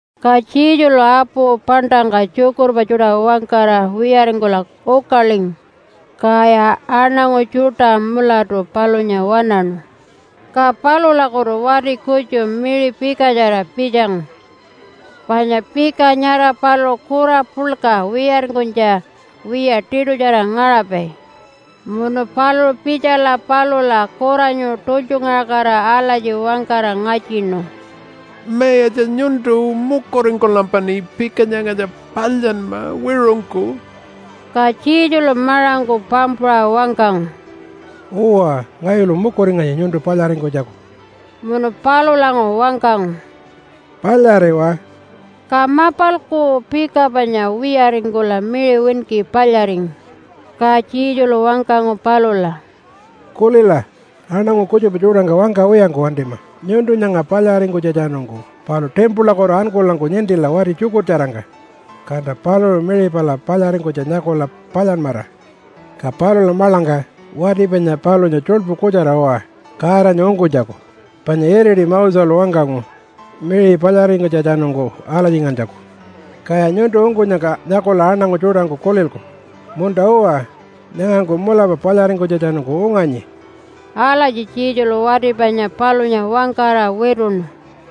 Ka Jesulu apu paṉṯangka tjukurpa tjuṯa wangkara wiyaringkula ukalingu, kaya aṉangu tjuṯa mulatu palunya waṉaṉu. Ka palulakutu wati kutju miṟi pikatjara pitjangu, panya pika nyara paluṟu kura puḻka wiyaringkunytja wiya tiṯutjara ngaṟapai. Munu paluṟu pitjala palula kuranyu tultjungaṟakatira alatji wangkara ngatjinu, “Mayatja nyuntu mukuringkulampaṉi pika nyangatja palyanma wiṟungku.” Ka Jesulu maṟangku pampuṟa wangkangu, “Uwa, ngayulu mukuringanyi nyuntu palyaringkunytjaku.” Munu palulanguṟu wangkangu, “Palyariwa!” Ka mapalku pika panya wiyaringkula miṟi winki palyaringu. Ka Jesulu wangkangu palula, “Kulila, aṉangu kutjupa tjuṯangka wangkawiyangku wantima nyuntu nyanga palyaringkunytjatjanungku. Palu timpulakutu ankulanku nintila wati tjukurtjarangka, kanta paluṟu miṟi pala palyaringkunytja nyakula palyanmara. Ka palula maḻangka wati panya palunya tjuḻpu kutjara uwa Godanya ungkunytjaku, panya iriti Moselu wangkangu miṟi palyaringkunytjatjanungku alatjingantjaku. Kaya nyuntu ungkunyangka nyakula aṉangu tjuṯangku kulilku, ‘Munta-uwa, nyangangku mulapa palyaringkunytjatjanungku unganyi.’” Alatji Jesulu wati panya palunya wangkara wituṉu.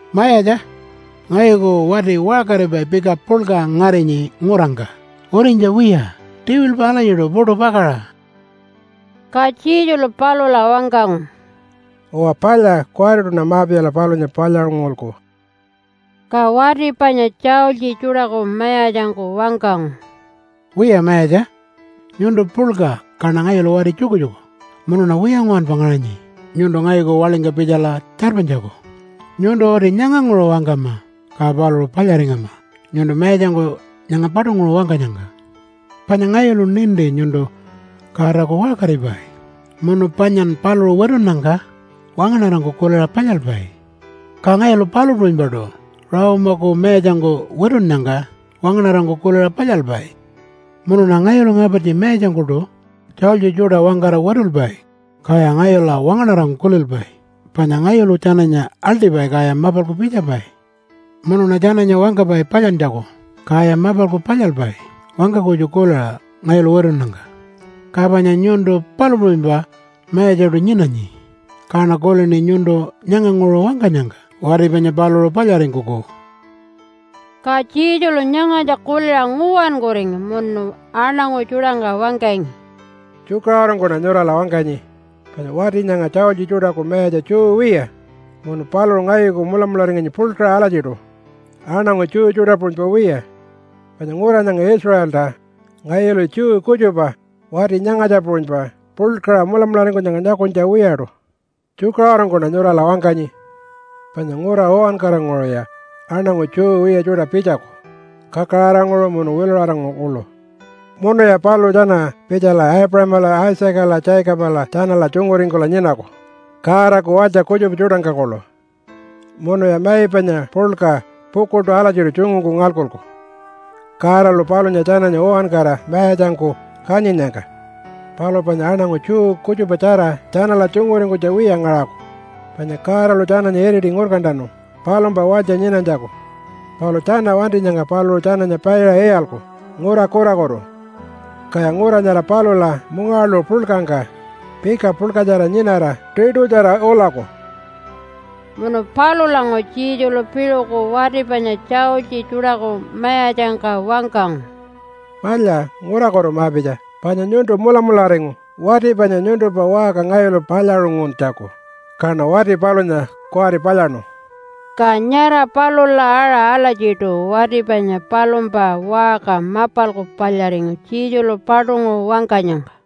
“Mayatja ngayuku wati waṟkaripai pika puḻka ngarinyi ngurangka urinytja wiya tiwilpa alatjiṯu puṯu pakaṟa.” Ka Jesulu palula wangkangu, “Uwa palya! Kuwariṯuṉa ma-pitjala palunya palyaṟungulku.” Ka wati panya tjaultji tjuṯaku mayatjangku wangkangu, “Wiya Mayatja, nyuntu puḻka kaṉa ngayulu wati tjukutjuku munuṉa wiya nguwanpa ngaṟanyi nyuntu ngayuku waḻingka pitjala tjarpanytjaku. Nyuntu uti nyanganguṟu wangkama, ka paluṟu palyaringama nyuntu mayatjangku nyanga paṯunguṟu wangkanyangka. Panya ngayulu ninti nyuntu Godaku waṟkaripai munu panyan paluṟu witunnyangka wangaṉarangku kuliṟa palyalpai. Ka ngayulu palu puṟunypaṯu Rome-aku mayatjangku witunnyangka wangaṉarangku kuliṟa palyalpai. Munuṉa ngayulu ngapartji mayatjangkuṯu tjaultji tjuṯa wangkara witulpai, kaya ngayula wangaṉarangku kulilpai. Panya ngayulu tjananya aḻṯipai, kaya mapalku pitjapai. Munuṉa tjananya wangkapai palyantjaku, kaya mapalku palyalpai wangka kutju kuliṟa ngayulu witunnyangka. Ka panya nyuntu palu puṟunypa mayatjaṯu nyinanyi, kaṉa kulini nyuntu nyanganguṟu wangkanyangka wati panya paluṟu palyaringkuku.” Ka Jesulu nyangatja kuliṟa nguwankuringu munu aṉangu tjuṯangka wangkangi, “Tjukaṟurungkuṉa nyurala wangkanyi, panya wati nyanga tjaultji tjuṯaku mayatja Jew wiya, munu paluṟu ngayuku mulamularinganyi puḻkaṟa alatjiṯu aṉangu Jew tjuṯa puṟunypa wiya. Panya ngura nyanga Israelta ngayulu Jew kutjupa wati nyangatja puṟunypa puḻkaṟa mulamularingkunyangka nyakunytja wiyaṯu. Tjukaṟurungkuṉa nyurala wangkanyi, panya ngura uwankaranguṟuya aṉangu Jew wiya tjuṯa pitjaku kakaraṟanguṟu munu wiluṟaranguṟu kuḻu. Munuya paluṟu tjana pitjala Aipuṟamala, Isaacala, Jacobala tjanala tjunguringkula nyinaku Godaku walytja kutjupa tjuṯangka kuḻu, munuya mai panya puḻka pukuḻṯu alatjiṯu tjungungku ngalkuku Godalu palunya tjananya uwankara mayatjangku kanyinnyangka. Palu panya aṉangu Jew kutjupatjara tjanala tjunguringkunytja wiya ngaṟaku. Panya Godalu tjananya iriti ngurkantanu palumpa walytja nyinanytjaku, palu tjana wantinyangka paluṟu tjananya paiṟa iyalku ngura kurakutu, kaya ngura nyara palula mungawaḻuṟu puḻkangka pika puḻkatjara nyinara tiṯutjara ulaku.” Munu palulanguṟu Jesulu piṟuku wati panya tjaultji tjuṯaku mayatjangka wangkangu, “Palya, ngurakutu ma-pitja! Panya nyuntu mulamularingu wati panya nyuntumpa waṟka ngayulu palyaṟunguntjaku, kaṉa wati palunya kuwari palyaṉu.” Ka nyara palula aṟa alatjiṯu wati panya palumpa waṟka mapalku palyaringu Jesulu paṯunguṟu wangkanyangka.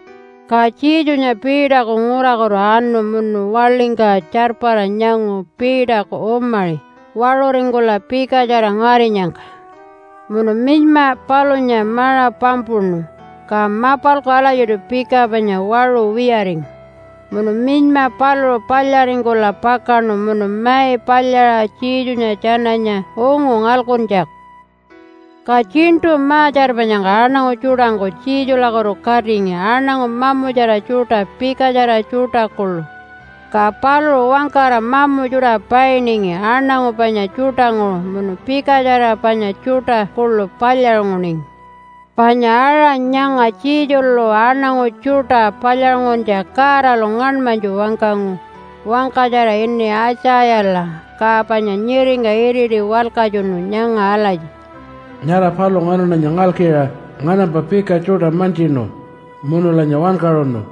Ka Jesunya Peterku ngurakutu anu munu waḻingka tjarpara nyangu Peterku umaṟi waṟuringkula pikatjara ngarinyangka. Munu minyma palunya maṟa pampuṉu, ka mapalku alatjiṯu pika panya waṟu wiyaringu. Munu minyma paluṟu palyaringkula pakaṉu munu mai palyaṟa Jesunya tjananya ungu ngalkuntjaku. Ka tjiṉṯu ma-tjarpanyangka aṉangu tjuṯangku Jesulakutu katingi aṉangu mamutjara tjuṯa pikatjara tjuṯa kuḻu. Ka paluṟu wangkara mamu tjuṯa painingi aṉangu panya tjuṯanguṟu munu pikatjara panya tjuṯa kuḻu palyaṟunguningi. Panya aṟa nyanga Jesulu aṉangu tjuṯa palyaṟunguntja Godalu ngaṉmanytju wangkangu wangkatjara ini Aitjayala, ka panya nyiringka iriti walkatjunu nyanga alatji, “Nyara paluṟu nganaṉanya ngalkiṟa nganampa pika tjuṯa mantjinu munulanya wankaṟunu.”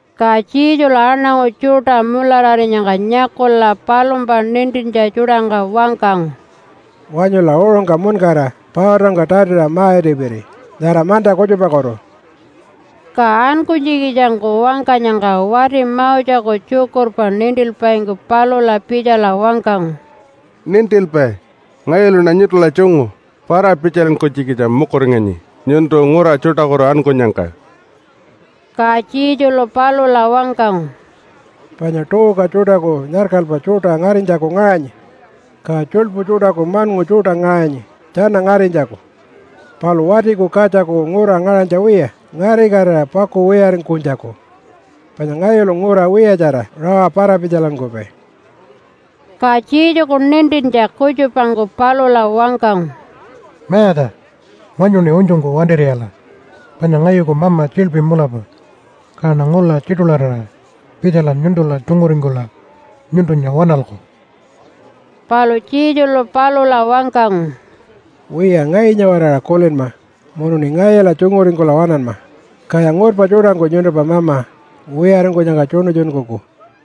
Ka Jesulu aṉangu tjuṯa mulararinyangka nyakula palumpa nintintja tjuṯangka wangkangu, “Wanyula uṟungka muṉkara pautangka tatiṟa ma-itipiri nyara manta kutjupakutu!” Ka ankunytjikitjangku wangkanyangka wati Moseku tjukurpa nintilpaingku palula pitjala wangkangu, “Nintilpai! Ngayuluṉa nyuntula tjungu para-pitjalinkunytjikitja mukuringanyi nyuntu ngura tjuṯakutu ankunyangka.” Ka Jesulu palula wangkangu, “Panya tuuka tjuṯaku nyarkalpa tjuṯa ngarinytjaku ngaṟanyi. Ka tjuḻpu tjuṯaku maṉngu tjuṯa ngaṟanyi tjana ngarinytjaku, palu Watiku Katjaku ngura ngaṟanytja wiya ngarikatira pakuwiyaringkunytjaku. Panya ngayulu ngura wiyatjara rawa para-pitjalinkupai.” Ka Jesuku nintintja kutjupangku palula wangkangu, “Mayatja! Wanyuṉi unytjungku wantir'iyala, panya ngayuku mama tjiḻpi mulapa, kaṉa ngula tjiṯularira pitjala nyuntula tjunguringkula nyuntunya waṉalku.” Palu Jesulu palula wangkangu, “Wiya, ngayunya-waraṟa kulinma munuṉi ngayula tjunguringkula waṉanma, kaya ngurpa tjuṯangku nyuntumpa mama wiyaringkunyangka tjuṉutjunkuku.”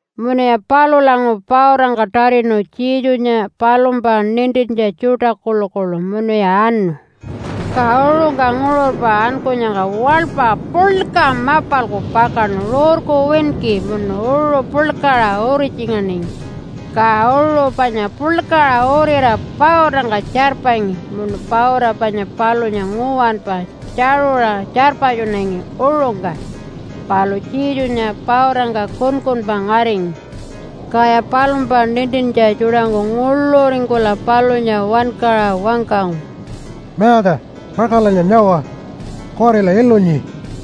Munuya palulanguṟu pautangka tatinu Jesunya palumpa nintintja tjuṯa kuḻukuḻu munuya anu. Ka uṟungka nguṟurpa ankunyangka waḻpa puḻka mapalku pakaṉu rurku winki munu uṟu puḻkaṟa uritjinganingi, ka uṟu panya puḻkaṟa uriṟa pautangka tjarpangi munu pauta panya palunya nguwanpa tjaṟuṟa tjarpatjunangi uṟungka. Palu Jesunya pautangka kunkunpa ngaringi. Kaya palumpa nintintja tjuṯangku nguḻuringkula palunya wankaṟa wangkangu, “Mayatja, pakaṟalanya nyawa! Kuwarila ilunyi.”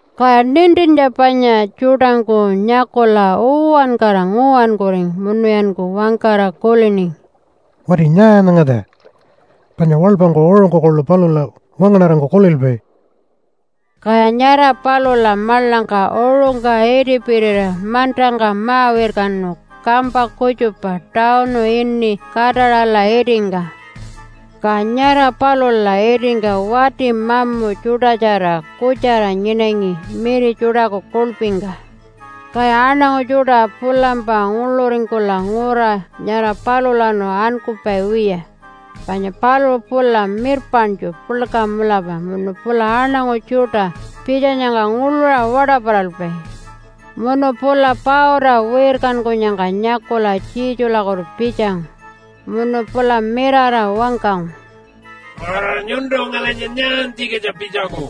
Kaya nintintja panya tjuṯangku nyakula uwankara nguwankuringu munuyanku wangkara kuliningi, “Wati nyaa nyangatja? Panya waḻpangku uṟungku kuḻu palula wangaṉarangku kulilpai.” Kaya nyara palula maḻangka uṟungka itipirira mantangka ma-wirkanu kampa kutjupa tawunu ini Kataṟala itingka. Ka nyara palula itingka wati mamu tjuṯatjara kutjara nyinangi miri tjuṯaku kuḻpingka. Kaya aṉangu tjuṯa pulampa nguḻuringkula ngura nyara palulawanu ankupai wiya, panya paluṟu pula mirpaṉtju puḻka mulapa munu pula aṉangu tjuṯa pitjanyangka nguḻuṟa waṯaparalpai. Munu pula pauta wirkankunyangka nyakula Jesulakutu pitjangu. Munu pula mirara wangkangu, “Nyuntu ngalinya nyaantjikitja pitjangu?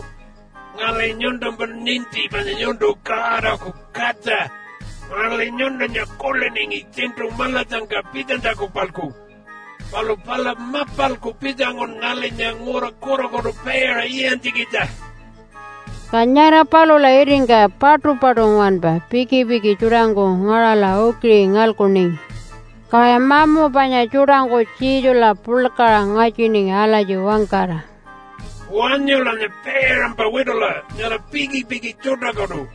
Ngali nyuntumpa ninti panya nyuntu Godaku Katja. Ngali nyuntunya kuliningi tjiṉṯu maḻatjangka pitjanytjaku-palku, palu pala mapalku pitjangun ngalinya ngura kurakutu paiṟa iyantjikitja.” Ka nyara palula itingka paṯupaṯu nguwanpa pikipiki tjuṯangku ngaṟala ukiṟi ngalkuningi. Kaya mamu panya tjuṯangku Jesula puḻkaṟa ngatjiningi alatji wangkara, “Wanyulanya paiṟampa witula nyara pikipiki tjuṯakutu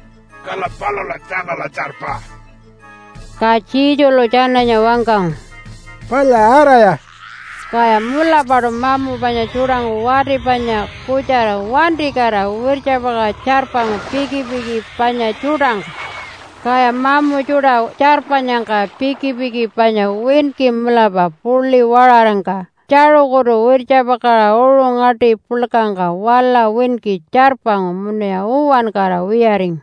kala palula tjanala tjarpa!” Ka Jesulu tjananya wangkangu, “Palya, araya!” Kaya mulapaṯu mamu panya tjuṯangku wati panya kutjara wantikatira wirtjapakaṟa tjarpangu pikipiki panya tjuṯangka. Kaya mamu tjuṯa tjarpanyangka pikipiki panya winki mulapa puḻi waṟarangka tjaṟukutu wirtjapakaṟa uṟu ngaṯi puḻkangka wala winki tjarpangu munuya uwankara wiyaringu.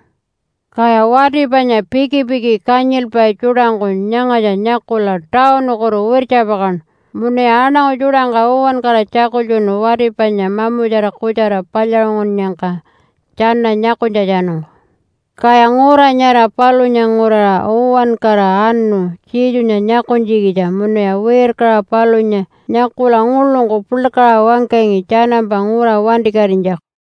Kaya wati panya pikipiki kanyilpai tjuṯangku nyangatja nyakula tawunukutu wirtjapakaṉu munuya aṉangu tjuṯangka uwankara tjakultjunu wati panya mamutjara kutjara palyaṟungunnyangka tjana nyakunytjatjanungku. Kaya ngura nyara palunya nguraṟa uwankara anu Jesunya nyakunytjikitja munuya wirkaṟa palunya nyakula nguḻungku puḻkaṟa wangkangi tjanampa ngura wantikatinytjaku.